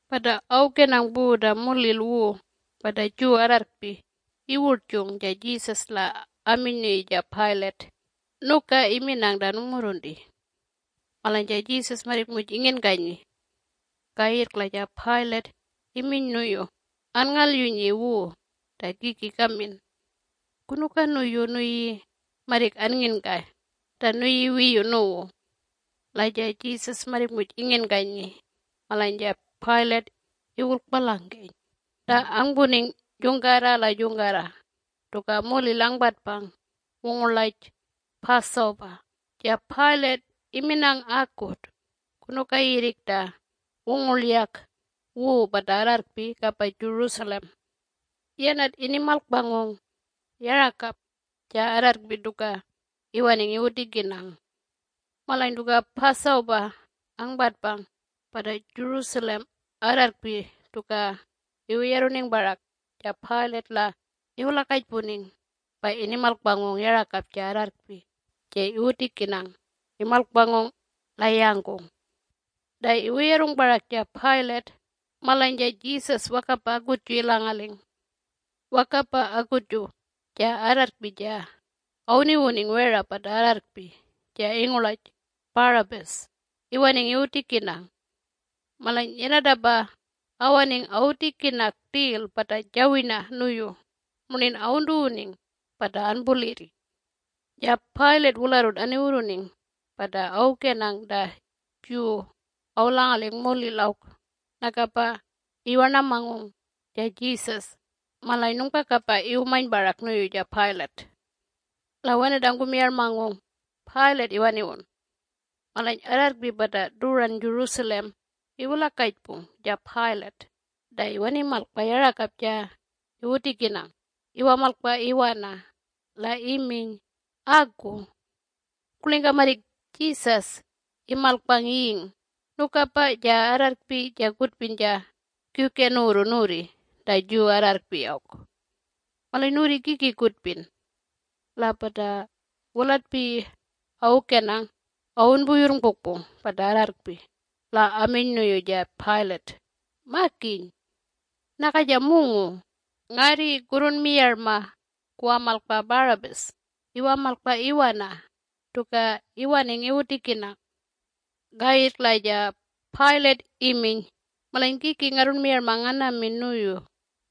Pata awukenang pu ta mulil wu pata Jew arrarrkpi iwurtjung ja Jesus la aminy nuyu ja Pilate, “Nuka iminang ta nungmurrunti.” Malany ja Jesus marrik muj inginkanyi. Kayirrk la ja Pilate iminy nuyu, “Anngalyunyi wu ta kiki kamin. Kunuka nuyu nuyi marrik annginkay ta nuyi wiyu nuwu?” La ja Jesus marrik muj inginkanyi, malany ja Pilate iwurlkpalangkeny. Ta angpuning jungkarra la jungkarra tuka mulil angpatpang wungurlaj Passover, ja Pilate iminang akut kunuka yirrik ta wungurlyak wu pata arrarrkpi kapa Jerusalem. Yanat inimalkpangung yarakap ja arrarrkpi tuka iwaning iwutikinang. Malany tuka Passover angpatpang pata Jerusalem arrarrkpi tuka iwuyarruning parak ja Pilate la iwulakajpuning pa inimalkpangung yarakapju ja arrarrkpi ja iwutikinang imalkpangung la yangkung. Ta iwuyarrung parak ja Pilate malany ja Jesus wakapa akutju ilangaling. Wakapa akutju ja arrarrkpi ja awuniwuning wera pata arrarrkpi ja ingurlaj Barabbas iwaning iwutikinang. Malany yanatapa awaning awutikinang rtil pata jawirna nuyu murnin awuntuwuning pata anpulirri. Ja Pilate wularrut aniwurruning pata awukenang ta Jew awulangaling mulil awk nakapa iwarnamangung ja Jesus malany nungpakapa iwumany parak nuyu ja Pilate. La wenat angkumiyarmangung Pilate iwaniwun. Malany arrarrkpi pata tuwuran Jerusalem iwulakajpung ja Pilate ta iwanimalkpa yarakap ja iwutikinang iwamalkpa iwana, la iminy, “Aku. Kurlingka marrik Jesus imalkpang ying, nukapa ja arrarrkpi ja kutpin ja kiwken nuwurru nuwurri ta Jew arrarrkpi awk. Malany nuwurri kiki kutpin?” La pata wulatpiyi awukenang awunpuyurrngpukpung pata arrarrkpi, la aminy nuyu ja Pilate, “Makiny! Naka ja mungu! Ngarri kurrunmiyarma kuwamalkpa Barabbas iwamalkpa iwana tuka iwaning iwutikinang.” Kayirrk la ja Pilate iminy, “Malany kiki ngarrunmiyarma nganamin nuyu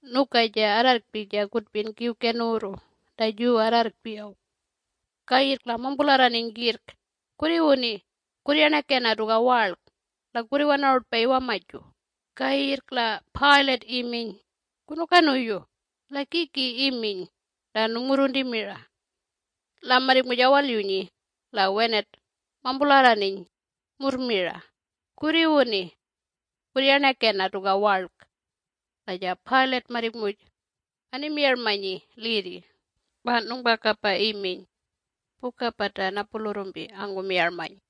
nuka ja arrarrkpi ja kutpin kiwken nuwurru ta Jew arrarrkpi awk?” Kayirrk la mampularraniny kirrk, “Kurriwuni! Kurryarnakena tuka warlk la kurriwanarutpa iwamaju!” Kayirrk la Pilate iminy, “Kunuka nuyu? La kiki iminy ta nungmurrunti mira?” La marrik muj awalyunyi, la wenat mampularraniny murr mira, “Kurriwuni! Kurryarnakena tuka warlk!” La ja Pilate marrik muj animiyarmanyi lirri, pa nungpakapa iminy puka pata napulurrumpi angkumiyarmany.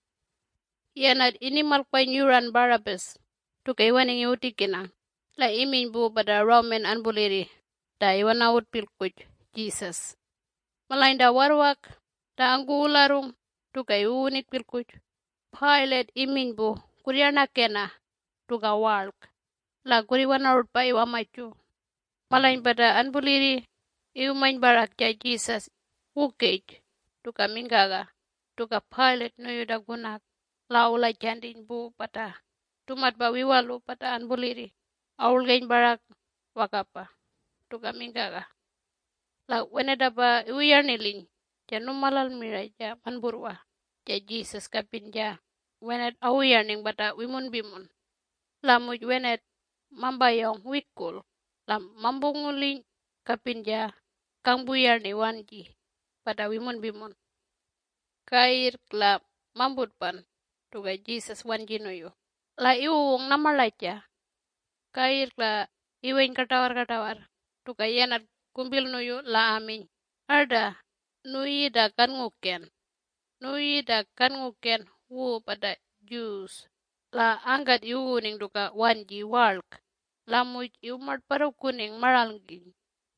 Yanat inimalkpany yuran Barabbas tuka iwaning iwutikinang la iminy pu pata Roman anpulirri ta iwanawun pilkuj Jesus. Malany ta warrwak ta angkuwularrung tuka iwuwuning pilkuj, Pilate iminy pu, “Kurryarnakena tuka warlk la kurriwanarutpa iwamaju.” Malany pata anpulirri iwumany parak ja Jesus wukaj tuka mingkaga tuka Pilate nuyu ta kunak. La awulajantiny pu pata tumatpa wiwalu pata anpulirri awurlgeny parak wakapa tuka mingkaga. La wenatapa iwuyarniliny ja numalal mira ja manpurrwa ja Jesus kapin ja wenat awuyarniny pata wimunpimun. La muj wenat mampayawng wikurl la mampunguliny kapin ja kangpuyarni wanji pata wimunpimun. Kayirrk la mamputpan tuka Jesus wanji nuyu La iwuwung namarlaja. Kayirrk la iweny kartawarrkartawarr tuka yanat kumpil nuyu la aminy, “Arta, nuyi ta kannguken. Nuyi ta kannguken wu pata Jew!” La angkat iwuwuning tuka wanji warlk, la muj iwumartparruning maralngkiny.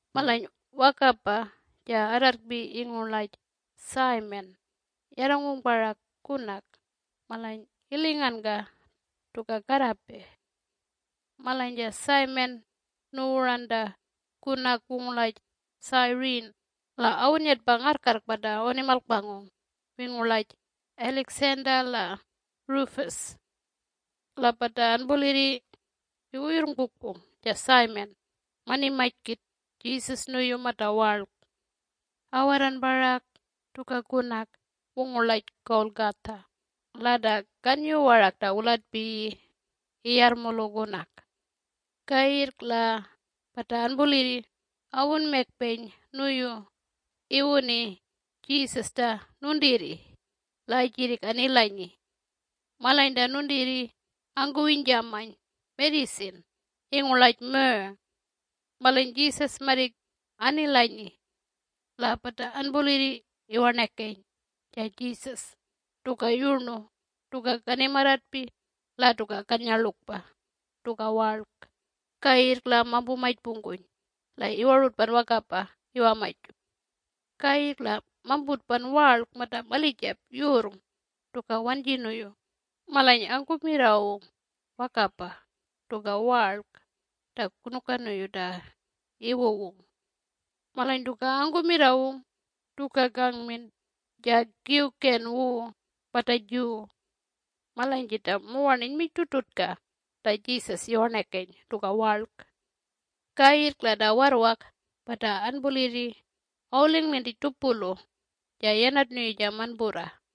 Malany wakapa ja arrarrkpi ingurlaj Simon yarrangung parak kunak malany ilinganka tuka karrape. Malany ja Simon nuwuran ta kunak wungurlaj Cyrene la awunnyatpang ngarrkarrk pata awunimalkpangung, wingurlaj Alexander la Rufus. La pata anpulirri iwuyurrngpukpung ja Simon manimany kit Jesus nuyu mata warlk. Awarran parak tuka kunak wungurlaj Golgotha la ta kanyu warak ta wulatpiyi Iyarrmulu Kunak. Kayirrk la pata anpulirri awunmakpeny nuyu iwuni Jesus ta nuntirri la ajirrik anilanyi. Malany ta nuntirri angkuwinyjamany mejijin ingurlaj myrrh. Malany Jesus marrik anilanyi. La pata anpulirri iwarnakeny ja Jesus tuka yurnu tuka kanimarratpi la tuka kannyarlukpa tuka warlk, kayirrk la mampumajpungkuny, la iwarutpan wakapa iwamaju. Kayirrk la mamputpan warlk mata malijap yurrng tuka wanji nuyu malany angkumirrawung wakapa tuka warlk ta kunuka nuyu ta iwuwung. Malany tuka angkumirrawung tuka kangmin Ja Kiwken wu pata Jew. Malany jita muwarn inyminy rtutrtutka ta Jesus iwarnakeny tuka warlk. Kayirrk la ta warrwak pata anpulirri awuling lintij tupulu ja yanat nuyu ja manpurra.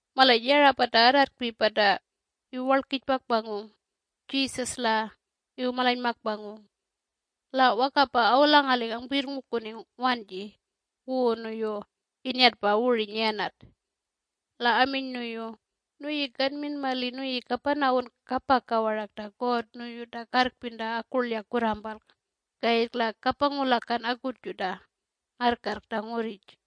Malany yara pata arrarrkpi pata iwuwarlkijpakpangung Jesus la iwumalanymakpangung. La wakapa awulangaling angpuyirrngukuning wanji wu nuyu innyatpa wurwiny yanat. La aminy nuyu, “Nuyi kanmin mali nuyi kapanawun kapaka warak ta God nuyu ta karrpin mira ta akurkyak kurrampalk kayirrk la kapangulakan akutju ta ngarrkarrk ta ngurrij.”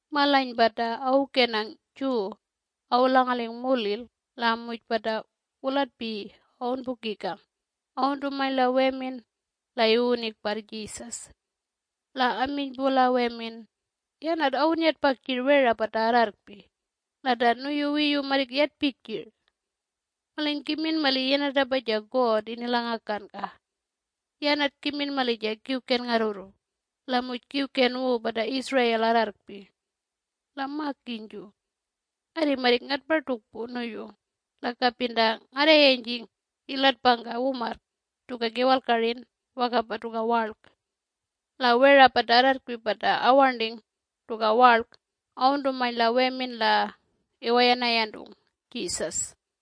Malany pata awukenang Jew awulangaling mulil la muj pata wulatpiyi awunpukikang awuntumany la wemin la iwuwuning parr Jesus. La aminy pu la wemin, “Yanat awunnyatpang jir wera pata arrarrkpi la ta nuyu wiyu marrik yatpay jir. Malany kimin mali yanatapa ja God inilangakanka. Yanat kimin mali ja kiwken ngarrurru, la muj kiwken wu pata Israel arrarrkpi. La makinyju! Ngarri marrik ngatpartukpu nuyu la kapin ta ngarrayanyjing ilatpangka wumarrk tuka kiwalkarin wakapa tuka warlk!” La wera pata arrarrkpi pata awarnting tuka warlk awuntumany la wemin la iwayanayantung Jesus.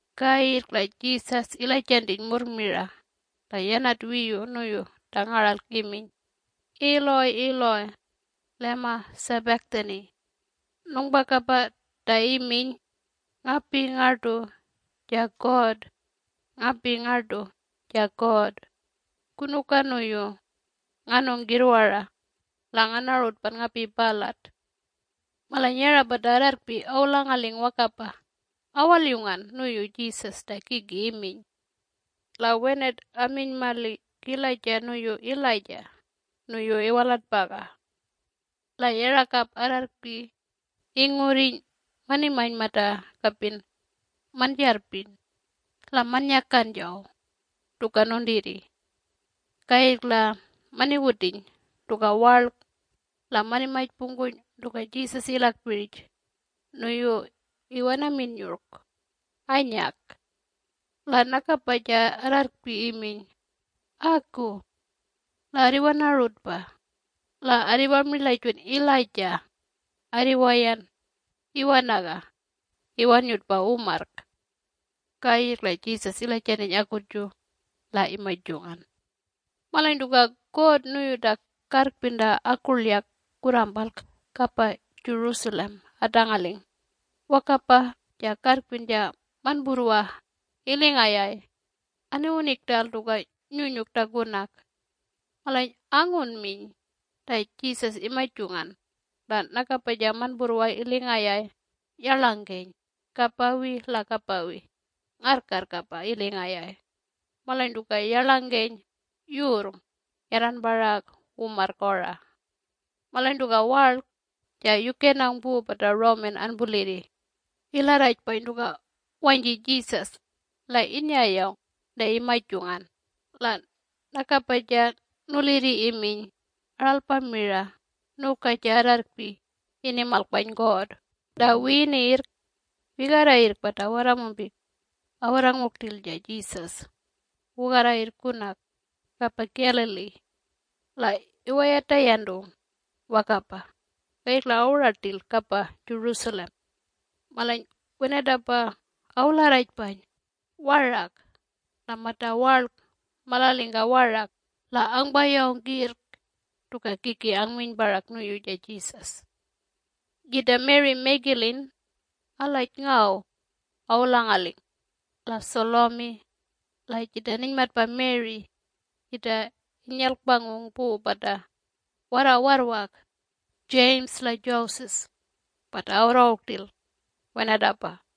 Kayirrk la Jesus ilajantiny murr mira la yanat wiyu nuyu ta ngaralk iminy, “Eloi Eloi lema sabachthani?” Nungpakapa ta iminy, “Ngapi ngartu ja God, ngapi ngartu ja God, kunuka nuyu nganung kirrwara la nganarutpan ngapi palat?” Malany yara pata arrarrkpi awulangaling wakapa awalyungan nuyu Jesus ta kiki iminy. La wenat aminy mali kilaja nuyu Elijah nuyu iwalatpaga. La yarakap arrarrkpi ingurriny manimany mata kapin manjarrpin la mannyakan jaw tuka nuntirri. Kayirrk la maniwutiny tuka warlk la manimajpungkuny tuka Jesus ilakpirij nuyu iwanamin yurlk anyak. La nakapa ja arrarrkpi iminy, “Aku. La arriwanarutpa. La arriwamirlajun Elijah arriwayan iwanaga iwannyutpa wumarrk.” Kayirrk la Jesus ilajantiny akutju, la imajungan. Malany tuka God nuyu ta karrpin mira ta akurlyak kurrampalk kapa Jerusalem atangaling wakapa ja karrpin ja manpurrwa iling ayay aniwuning rtal tuka nyunyuk ta kunak. Malany angunminy ta Jesus imajungan, la nakapa ja manpurrwa iling ayay yarlangkeny kapawi la kapawi ngarrkarrk apa iling ayay, malany tuka yarlangkeny yurrng yarran parak wumarrk ora. Malany tuka warlk, ja yukenang pu pata Roman anpulirri ilarrajpany tuka wanyji Jesus, la innyayawng ta imajungan, la nakapa ja nulirri iminy, “Aralpa mira nuka ja arrarrkpi inimalkpany God!” Ta wiyinirrk wigarra yirrk pata warramumpik awarrangung rtil ja Jesus wugarra yirrk kunak kapa Galilee. La iwayatayantung wakapa, kayirrk la awuran rtil kapa Jerusalem. Malany wenatapa awularrajpany warak la mata warlk malangalingka warak la angpayawng kirrk tuka kiki angminy parak nuyu ja Jesus. Jita Mary Magdalene algaj ngaw awulangaling la Salome la jita ninymatpa Mary jita inyalkpangung pu pata warrawarrwak James la Joses, pata awarrangung rtil wenatapa.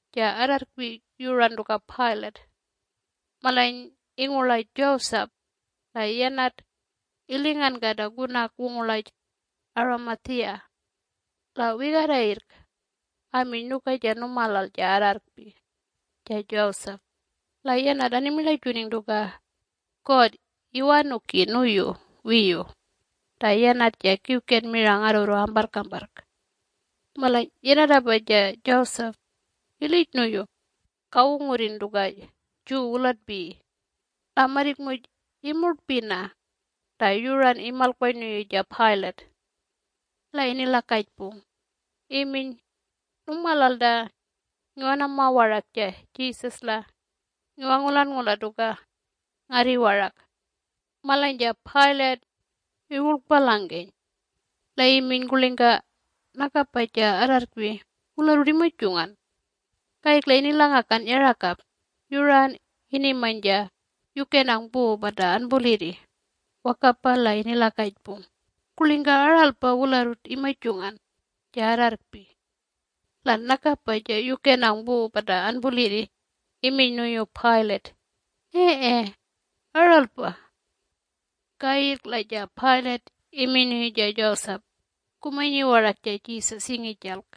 ja arrarrkpi yuran tuka Pilate. Malany ingurlaj Joseph la yanat ilinganka ta kunak wungurlaj Arimathea. La wigarra yirrk aminy nuka ja numalal ja arrarrkpi ja Joseph. La yanat animirlajuning tuka God iwanuki nuyu wiyu ta yanat ja kiwken mira ngarrurru amparrkamparrk. Malany yanatapa ja Joseph ilij nuyu kawungurrin tuka Jew Wulatpiyi. La marrik muj imurtpina ta yuran imalkpany nuyu ja Pilate. La inilakajpung iminy, “Nungmalal ta ngiwanama warak ja Jesus la ngiwangulanngula tuka ngarri warak?” Malany ja Pilate iwurlkpalangkeny. La iminy, “Kurlingka nakapa ja arrarrkpi wularrut imajungan?” Kayirrk la inilangakan yarakap yuran inimany ja yukenang pu pata anpulirri wakapa la inilakajpung, “Kurlingka aralpa wularrut imajungan ja arrarrkpi?” La nakapa ja yukenang pu pata anpulirri iminy nuyu Pilate, “Ee, aralpa.” Kayirrk la ja Pilate iminy nuyu ja Joseph, “Kumanyi warak ja Jesus ingijalk.”